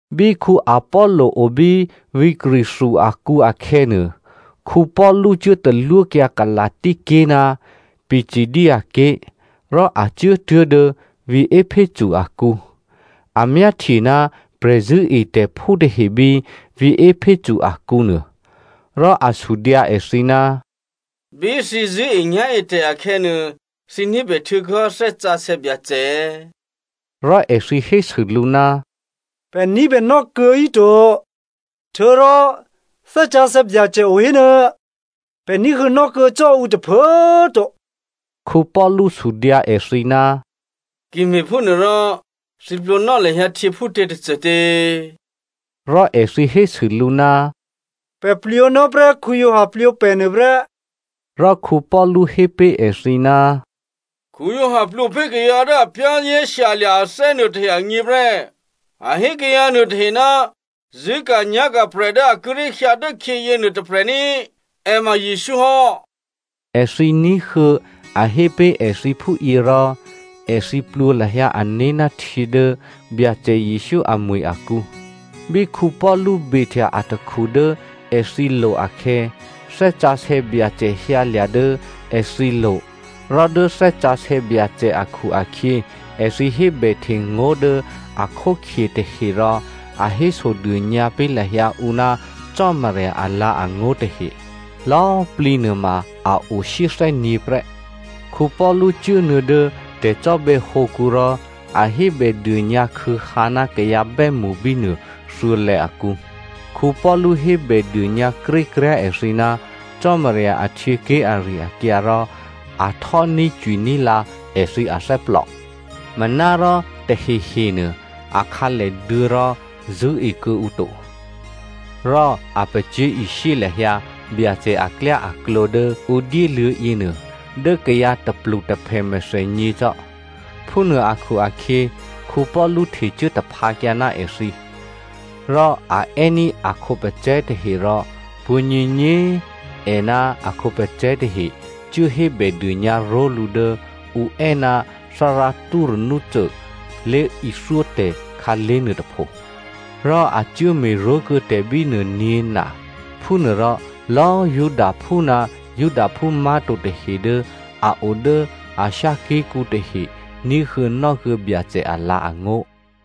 Bí Apollo obí vǐ̤ Corinthia akǔ akhè̌nuô, Paulu cuốtalwókyǎ Galasia ké̤ ná Pisidia ké̤, rò a cuốtuố̤ dố vǐ̤ Epheso akǔ. A myáhtye ná prè̤zṳ̂́etè̤phú tahe bí vǐ̤ Epheso akǔnuô. Rò a sudyǎ èthǐ, “Bí thǐ zṳ̂́enyá̤etè̤ akhè̌nuô, thǐ ní̤bè htuô̌kuô̌hò́ Thè́ Sǎsè̌ Byacè è̌?” Rò èthǐ hésû lǔ, “Pè̤ ní̤bè nò́kuô̌ híto. Htuô̌rò Thè́ Sǎsè̌ Byacè o hénuô̌꤮, pè̤ ní̤huô̌nò́ kuô̌ cò́ ǔ tôphuố꤮ to.” Paulu sudyǎ èthǐ, “Ki me̤phúnuôrò thǐ plwǒnò́ lahyǎ htyě phútě tôcôtě?” Rò èthǐ hésû lǔ, “Pè̤ plwǒnò́ prè́ Giovanni plwǒ pè̤ nuô prè́.” Rò Paulu hé pé̤ èthǐ, “Giovanni plwǒ pé̤ kayǎ dố a za̤ ní̤dû ané̤ hò́ nuôtahe agně prè́. A hé kayǎ nuôtahe ná zṳ̂́ka̤nyá̤ka̤ prè̤ dố a kíré̤ hyǎ dốkhyě yěnuô tôprè̤ ní꤮, è ma Jesǔ hò́.” Èthǐ ní̤huô̌ a hé pé̤ èthǐ phúyě rò, èthǐ plwǒ lahyǎ ané̤ ná htyě dố Byacè Jesǔ amwi̤ akǔ. Bí Paulu behtya atakhu dố èthǐlo̤ akhè̌, Thè́ Sǎsè̌ Byacè hyǎlya̤ dố èthǐlo̤ rò dố Thè́ Sǎsè̌ Byacè akhu-akhyě èthǐ hébèhtengó̤ dố a khókhye tahe rò a hésodônyǎ pé̤ lahyǎ ǔ ná Cò́marya alǎ̤angó̤ tahe. Lò̌꤮ plǐ nuôma a o shyéthè́nyě̤ prè́. Paulu cuốnuô̌ dố tè̤cò́bè̌hǒkǔ rò a hébèdônyǎ khû̌hǎ ná kayǎ bè́mṳ bínuô thuô̌lè̌ akǔ. Paulu hébèdônyǎ krékryá̤ èthǐ, Cò́marya ahtyěké̤ ari-akyǎ rò a htò́ní̤cwiní̤ lǎ èthǐ athè́plò. Manárò tahehenuô a khǎlèduô̌ rò zṳ̂́e kuô̌ǔ to. Rò a pacyé̤ishyé lahyǎ Byacè aklyáaklǒ dố ǔ dyéluô̌ yěnuô dố kayǎ tôplutôphè mèthènyě cò́. Phúnuô akhu-akhyě, Paulu htecuố taphǎkyǎ ná èthǐ. Rò a è́ní̤ a khǒpacè̤̌ tahe rò pwǒ̤nyěnyě꤮ è ná a khǒpacè̤̌ tahe cuố hébèdônyǎ ró̤lǔ dố ǔ è́ ná Thárá Tyranno lé̤ithyótè̤ khǎlé̤ nuôtôpho. Rò a cuố me̤ró̤kuô̌ tè̤ bínuô nyě̤na. Phúnuôrò lò̌꤮ Judaphú ná Judaphú má̤to tahe dố a o dố Asia ké̤kǔ tahe ní̤huô̌nò́ kuô̌ Byacè alǎ̤angó̤.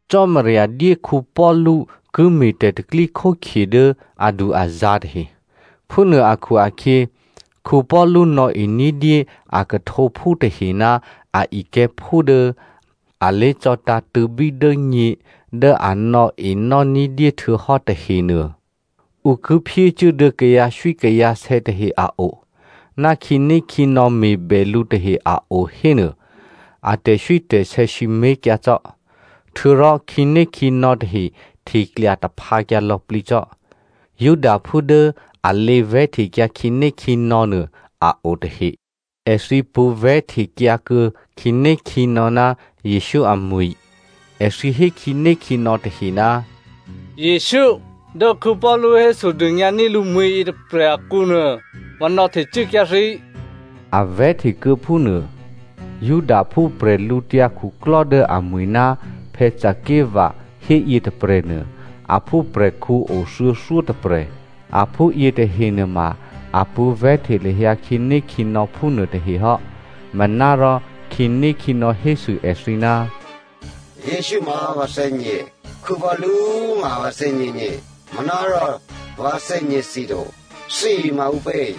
Cò́marya dyé Paulu ki me̤ tè̤pro̤tè̤prya̤ dố adu-azǎ̤ tahe. Phúnuô akhu-akhyě, Paulu nò̌e ní̤dyé a khuhtǒphú tahe ná a ikè̤̌phú dố a lé̤cò̌tǎ̤tṳ̂̌bí dố nyě dố a nò̌enò́ ní̤dyé htuô̌hò́ tahenuô, ǔ ki phyécuố dố kayǎswíkayǎsè̌ tahe a o, ná khǐnékhǐnò̌ me̤bè lǔ tahe a o hénuô, a tè̤swítè̤sè̌ sǐmé̤kyǎ cò́. Htuô̌rò khǐnékhǐnò̌ tahe hteklya taphǎkyǎ lò̌plǐ cò́. Judaphú dố a lěvè̤́htekyǎ khǐnékhǐnò̌nuô a o tahe. Èthǐ pṳ̌ vè̤́htekyǎ kuô̌ khǐnékhǐnò̌ ná Jesǔ amwi̤. Èthǐ hé khǐnékhǐnò̌ tahe, “Jesǔ, dố Paulu hésodônyǎní̤ lǔmwi̤ yětôprè̤ akǔnuô, vǎ nò̌htecuốkyǎ thǐ,” a vè̤́hte kuô̌ phúnuô. Judaphú prè̤lǔtyǎ khuklò́ dố amwi̤ ná Sceva hé yětôprè̤nuô, a phúprè̤khǔ o thuô̌thyótôprè̤. Aphú yětahe nuôma a pṳ̌ vè̤́hte lahyǎ khǐnékhǐnò̌ phúnuô tahehò́. Manárò khǐnékhǐnò̌ hésû èthǐ, “Jesǔ ma vǎ thè́gně. Paulu ma꤮ vǎ thè́gněgně. Manárò vǎ thè́gně thǐ to. Thǐ ma ǔpě?”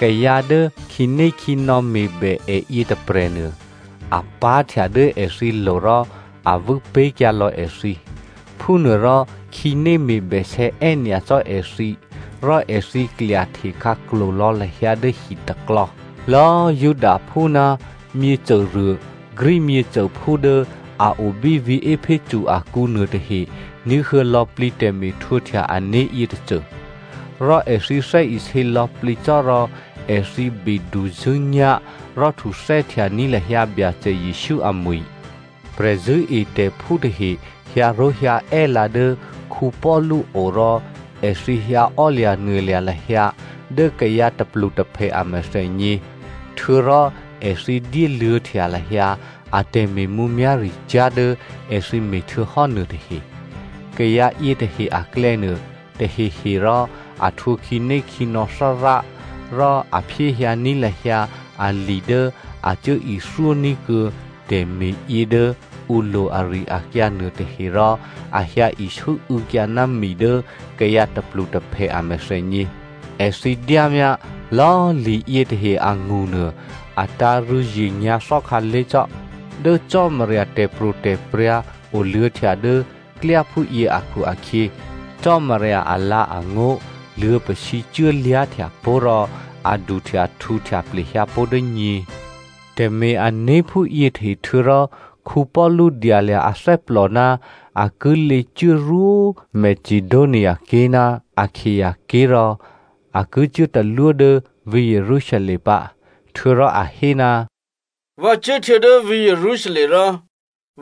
Kayǎ dố khǐnékhǐnò̌ me̤bè è yětôprè̤nuô, a pá̤htya dố èthǐlo̤ rò a vû́pé̤kyǎ lò̌ èthǐ. Phúnuôrò khǐné me̤bèsè̌ è́nyacò́ èthǐ rò èthǐ klyahte khǎklo̤ lò̌ lahyǎ dố hitaklò̌. Lò̌꤮ Judaphú ná myěcôruô Greek myěcôphú dố a o bí vǐ̤ Epheso akǔ nuôtahe ní̤huô̌ lò̌plǐ tè̤me̤htwǒhtya ané̤ yětôcô. Rò èthǐ thè́isě lò̌plǐ cò́ rò èthǐ beduzṳ̂́nyá̤, rò htuthè́htyaní̤ lahyǎ Byacè Jesǔ amwi̤. Prè̤zṳ̂́etè̤phú tahe hyǎró̤hyǎè́lǎ dố Paulu o rò èthǐ hyǎ ò́lya̤nuôlya̤ lahyǎ dố kayǎ tôplutôphè a mèthènyě, htuô̌rò èthǐ dyéluô̌htya lahyǎ a tè̤me̤mǔmyá̤ricyá̤ dố èthǐ me̤htuô̌hò́ nuôtahe. Kayǎ yětahe aklè̌nuô, tahehe rò a htwǒ khǐnékhǐnò̌ Thárá rò a phyéhyǎní̤ lahyǎ ali dố a cuốithyóní̤ kuô̌ tè̤me̤yě dố ǔlo̤ ari-akyǎ nuôtahe rò a hyǎ isû́û̌kyǎ ná mi dố kayǎ tôplutôphè a mèthènyě. Èthǐ dyámyá lò̌꤮ li yětahe angṳnuô, a tǎ̤ rû̌zye nyǎ̤thò́ khǎlé̤cò́. Dố Cò́marya tè̤pro̤tè̤prya̤ oluô̌htya dố klyá phúyě akhu-akhyě, Cò́marya alǎ̤angó̤ luô̌pasǐ cuốlyá̤htya pó̤ rò a duhtyahtǔhtya plehyǎ pó̤ dố nyě. Tè̤me̤-ané̤ phúyětahe htuô̌rò Paulu dyalya̤ athè́plò ná a ki lěcuốrwó Macedoniaké̤ ná Akaia ké̤ rò a ki cuốtalwó dố vǐ̤ Jerusalem pǎ. Htuô̌rò a hé, “Vǎ cuốhtuô̌ dố vǐ̤ Jerusalem rò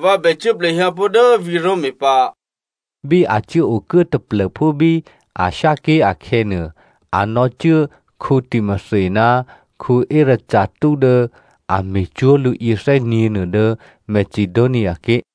vǎ bè cuố plehyǎ pó̤ dố vǐ̤ Roma pǎ.” Bí a cuố okuố taplô̤phú bí Asia ké̤ akhè̌nuô, a nò̌cuố Timothy ná Erasto dố a me̤cwó̤ lǔ yěthè́nyě̤nuô dố Macedoniaké̤.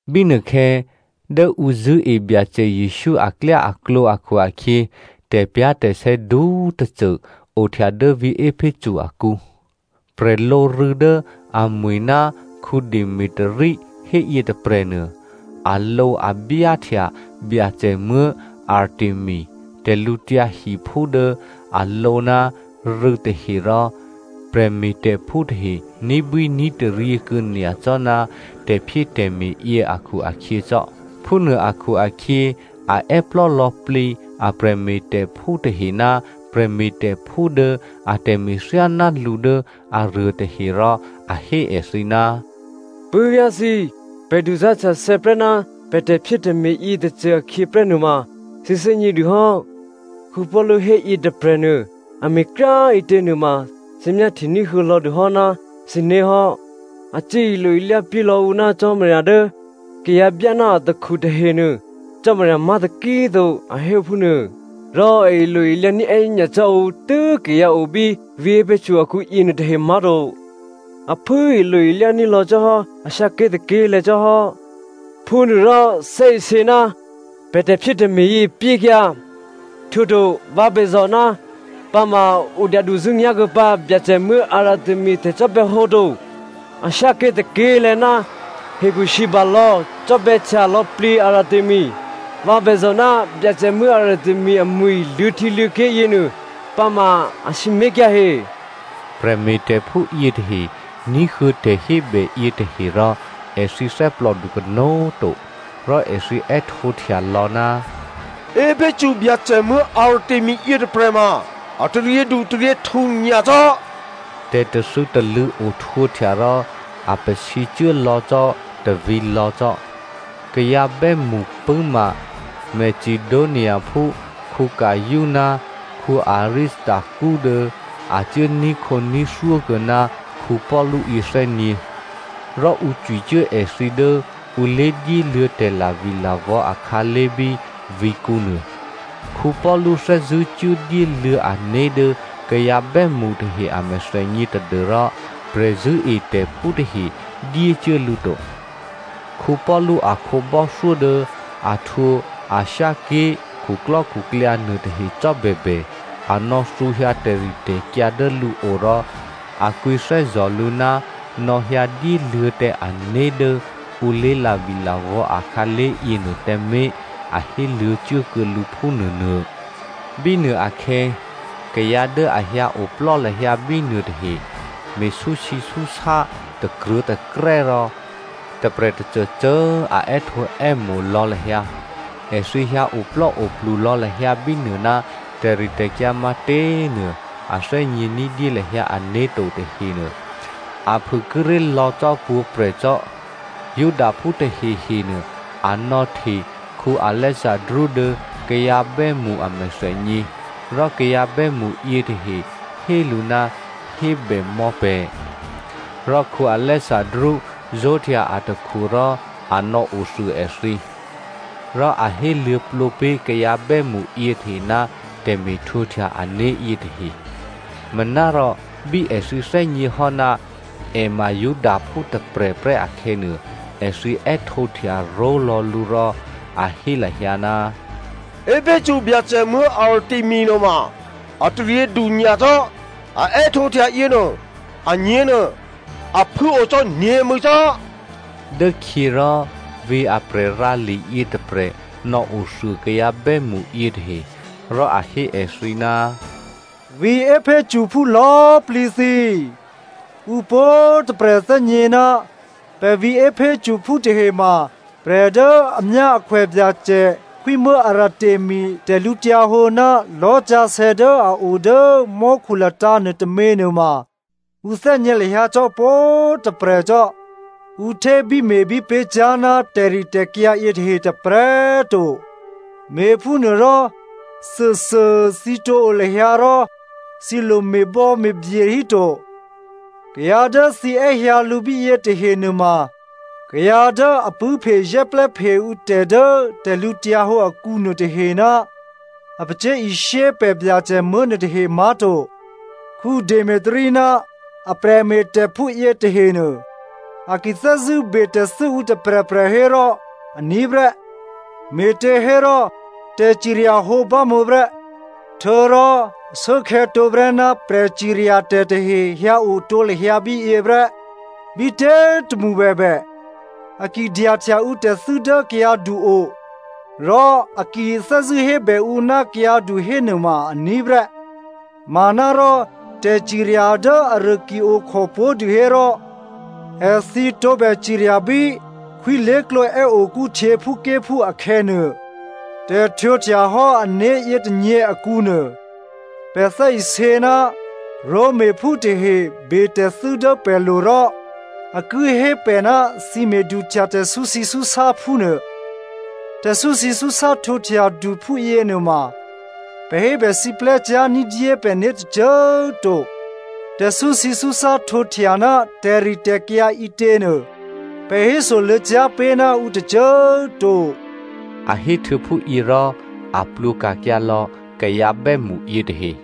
Bínuôkhè̌, dố ǔ zṳ̂́e Byacè Jesǔ aklyáaklǒ akhu-akhyě, tè̤pyá̤tè̤sè̌ du꤮ tôcô ohtya dố vǐ̤ Epheso akǔ. Prè̤lǒrû̌ dố amwi̤ ná Demetrio hé yětôprè̤nuô, alǒabyáhtya Byacè muố̤ Artemi tè̤lǔtyǎhiphú dố a lǒ ná rû̌ tahe rò prè̤me̤tè̤phú tahe ní̤bwíní̤taryě kuô̌ nyacò́ ná tè̤phyétè̤me̤ yě akhu-akhyě cò́. Phúnuô akhu-akhyě a è́plò́ lò̌plǐ a prè̤me̤tè̤phú tahe ná prè̤me̤tè̤phú dố atè̤me̤ thyáná lǔ dố aruô tahe rò a hé èthǐ, “Puố̤vyá̤ thǐ꤮, pè̤ duzá̤htyathè̌ prè́ ná pè̤ tè̤phyétè̤me̤ yětôcô akhyě prè́ nuôma thǐ thè́gně dûhò́. Paulu héyě tôprè̤nuô a me̤kryá꤮ ǐtě nuôma thǐ myáhtyení̤huô̌ lò̌dûhò́ ná thǐné̤ hò́. A cuố ilo-ilyá pyé lò̌ ǔ ná cò́marya dố kayǎ byá ná atakhu tahenuô, cò́marya má̤ taki꤮ to, a hé phúnuô. Rò a ilo-ilyá ní̤ è́nyacò́ ǔ tû́ kayǎ obí vǐ̤ Epheso akǔyě tahenuô má̤to, a phû꤮ ilo-ilyá ní̤lò̌ cò́hò́ Asia ké̤ tôké̤lè̤̌ cò́hò́. Phúnuôrò, thè́isě ná pè̤ tè̤phyétè̤me̤ yě pyékyǎ. Htuô̌to vǎ bèzò̤ ná pǎma ǔ dyaduzṳ̂́nyá̤ kuô̌ pǎ byacè muố̤ Artemi a tè̤cò́bè̌hǒ to. Asia ké̤ tôké̤lè̤̌ ná hekhusǐbalò̌ cò́bè̌htya lò̌plǐ Artemi. Vǎ bèzò̤ ná byacè muố̤ Artemi amwi̤ luô̌htyěluô̌ké̤ yěnuô, pǎma a sǐmé̤kyǎ he.” Prè̤me̤tè̤phú yětahe ní̤huô̌ tè̤hébè yětahe rò èthǐ thè́plòdu kanó̤꤮ to, rò èthǐ è́htǒhtya lò̌, “Epheso Byacè muố̤ Artemi yětôprè̤ ma a taryědutaryěhtǔ nyacò́!” Tè̤tathû̌talṳ̂̌ ohtwǒhtya rò a pasǐcuố lò̌ cò́ tôvǐ̤lò̌ cò́. Kayǎ bè́mṳ pṳ̂́ma Macedoniaphú Gaio ná Aristarko dố a cuố ní̤khǒní̤thyó kuô̌ná Paulu yěthè́nyě̤. Rò ǔ cwicuố èthǐ dố ǔ lé̤dyéluô̌ tè̤lavilavò̌ akhǎlé̤ bí vǐ̤kǔnuô. Paulu thè́zṳ̂́ cuố dyéluô̌ ané̤ dố kayǎ bè́mṳ tahe a mèthènyě tadû́rò prè̤zṳ̂́etè̤phú tahe dyécuố lǔ to. Paulu a khǒbò́thyó dố a htwǒ Asia ké̤ khuklò́khuklyǎ nuôtahe cò́bèbè, a nò̌thǔhyǎ tè̤ritè̤kyǎ dố lǔo rò a kwǐthè́zò̤ lǔ ná nò̌hyǎ dyéluô̌ tǎ ané̤ dố ǔ lé̤lavilavò̌ akhǎlé̤ yěnuô tǎmé̤ a héluô̌ cuố kuô̌ lǔ phúnuônuô. Bínuôakhè̌, kayǎ dố a hyǎoplò́ lahyǎ bínuô tahe me̤súsǐsúsá takruô̤̌takrè́ rò tôprè̤ tôcôcô꤮ a è́htǒè́mo̤ lò̌ lahyǎ. Èthǐ hyǎ oplò́oplulò̌ lahyǎ bínuô ná tè̤ritè̤kyǎ matě꤮ nuô a thè́gně ní̤dyé lahyǎ ané̤to tahenuô, a phû kíré̤ lò̌ cò́ pwǒ̤prè̤ cò́. Judaphú tahehenuô a nò̌hte Alexandro dố kayǎ bè́mṳ a mèthènyě, rò kayǎ bè́mṳ yětahe hé lǔ ná hébè mò̌ pè̤. Rò Alexandro zó̤htya atakhu rò a nò̌othuô èthǐ. Rò a héluô̌plǒ pé̤ kayǎ bè́mṳ yětahe ná tè̤me̤htwǒhtya ané̤ yětahe. Manárò bí èthǐ thè́gněhò́ ná è ma Judaphú tôprè̤prè́ akhè̌nuô, èthǐ è́htǒhtya ró̤lò̌ lǔ rò a hé lahyǎ, “Epheso Byacè muố̤ Artemi nuôma ataryědu nyacò́! A è́htǒhtya yěnuô, anyě̤nuô a phû꤮ o cò́ nyě̤mû̌cò́.” Dốkhyě rò vǐ̤ a prè̤rǎli yětôprè̤ nò̌othuô kayǎ bè́mṳ yětahe, rò a hé èthǐ, “Vǐ̤ Ephesophú lò̌꤮ plǐ thǐ꤮, ǔ pwǒ̤꤮ tôprè̤ thè́gně ná pè̤ vǐ̤ Ephesophú tahema prè̤ dố amyáakhwè Byacè khwímuố̤ Artemi tè̤lǔhǒdu ná lò̤́sǎsè̌ dố a o dố mò́khu latǎ̤ nuôtômě nuôma ǔ thè́gně lahyǎ cò́ pwǒ̤꤮ tôprè̤ cò́. Ǔ htébíme̤bí pé̤cyá̤ ná tè̤ritè̤kyǎ yětahe tôprè̤꤮ to. Me̤phúnuôrò, thuôthuô꤮ thǐ tǒ o lahyǎ rò thǐ lo me̤bò̌me̤bye híto. Kayǎ dố thǐ è́hyǎ lǔ bíyě tahe nuôma kayǎ dố a pṳ̂́phezè́plè́phe ǔtè̤ dố tè̤lǔhǒdu akǔ nuôtahe ná a pacyé̤ishyé pè̤ byacè muố̤ nuôtahe má̤to. Demetrio ná a prè̤me̤tè̤phú yětahenuô, a ki thè́zṳ̂́ be tè̤thû́ ǔ tôprè̤prè̤ hérò aní̤ prè́. Me̤těhérò tè̤ciryahǒ bámǒ prè́, htuô̌rò ashuốkhè̌ tǒprè́ ná prè̤ciryatè̤ tahe hyǎo tǒ lahyǎ bíyě prè́. Bítě꤮ tômṳ bèbè, a ki dyahtya ǔtè̤thû́ dố kayǎdu-o, rò a ki thè́zṳ̂́ hébè ǔ ná kayǎdu hénuôma aní̤ prè́. Manárò tè̤cirya dố aruô ki okhò pó̤dû hérò, èthǐ tǒbè cirya bí khwí lé̤klǒ è́okú htyěphúké̤phú akhè̌nuô. Tè̤htwǒhtyahò́ ané̤ yětônyě akǔnuô, pè̤ thè́isě ná Romaphú tahe betè̤thû́ dố pè̤lo̤ rò a ki hé pè̤ ná thǐ me̤duhtya tè̤súsǐsúsá phúnuô. Tè̤súsǐsúsá htwǒhtyadu phúyěnuôma, pè̤ hébèsiplè́cyá̤ ní̤dyé pè̤né̤ tôcô꤮ to. Tè̤súsǐsúsá htwǒhtya ná tè̤ritè̤kyǎ ǐtěnuô, pè̤ hésoluô̌cyá̤ pé̤ ná ǔ tôcô꤮ to.” A héhtuô̌ phúyě rò, a plwǒka̤kyǎ lò̌ kayǎ bè́mṳ yětahe.